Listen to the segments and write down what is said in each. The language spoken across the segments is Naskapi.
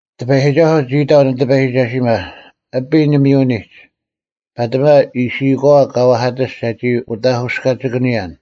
ᑎᐸᔨᒋᒐᓱᐤ ᒋ ᐃᑕᐤ ᓂᑎᐸᔨᒋᒐᓯᒪ, “ᐊᐱ ᓂᒥᔪᐅᓂᒡ, ᐸᑎᒪ ᐃᓯᐃᒂᐛ ᑲ ᐛᐧᑲᑎᔅᒡ ᒐᒋ ᐅᑕᑯᔅᑲᒋᑭᓂᔨᓐ᙮”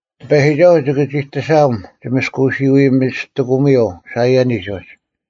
ᑎᐸᔨᒋᒐᓱᐤ ᒋᑭ ᒋᑎᓴᐊᒻ ᒋ ᒪᔅᑲᓱᐎ ᒥᔅᑎᑯᒥᔪᐤ ᓴᐃᔭᓂᒡ ᐅᒡ: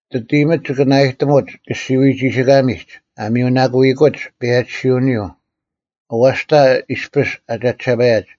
ᒋᑦ ᐃᔨᒥᒡ ᒋᑭ ᓇᐊᔨᑎᒧᒡ ᑲᔅᒋᐅᐎ ᒋᓯᑲᒥᒡ, ᐊ ᒥᔪᓇᑯᐃᑯᒡ ᐸᔭᒋᓯᐅᓂᔪᐤ, ᐊᐛᔅᑕ ᐃᔅᐱᔅ ᐊ ᒐᒋᓴᐸᔭᒡ: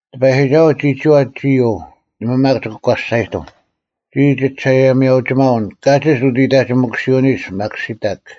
ᑎᐸᔨᒋᒐᓱᐤ ᒋᒋᐛ ᒋ ᐃᔪᐤ, ᓇᒪ ᒪᒃ ᒋᑭ ᒂᔅᒐᔨᑎᒻ, “ᒋᔾ ᒋᒋᓴᐊᔭᒥᐊᐅᒋᒪᐅᓐ ᑲᒋᒡ ᐅᑦ ᐃᑕᒋᒥᑯᓯᐅᓂᒡ ᒪᓪᑭᓴᑕᒃ᙮”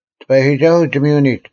ᑎᐸᔨᒋᒐᓱᐤ ᒋᒥᔪᐅᓂᒡ,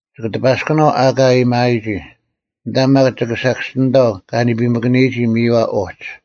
ᒋᑭ ᑎᐸᔅᑯᓇᐤ ᐊᑲ ᐊᔭᒥᐊᔨᒋ, ᐊᓐᑕ ᒪᒃ ᒋᑭ ᓴᑭᔅᒋᓂᑕᐤ ᑲ ᓂᐱᒥᑭᓂᔨᒋ ᒥᔪᐛ ᐅᒡ,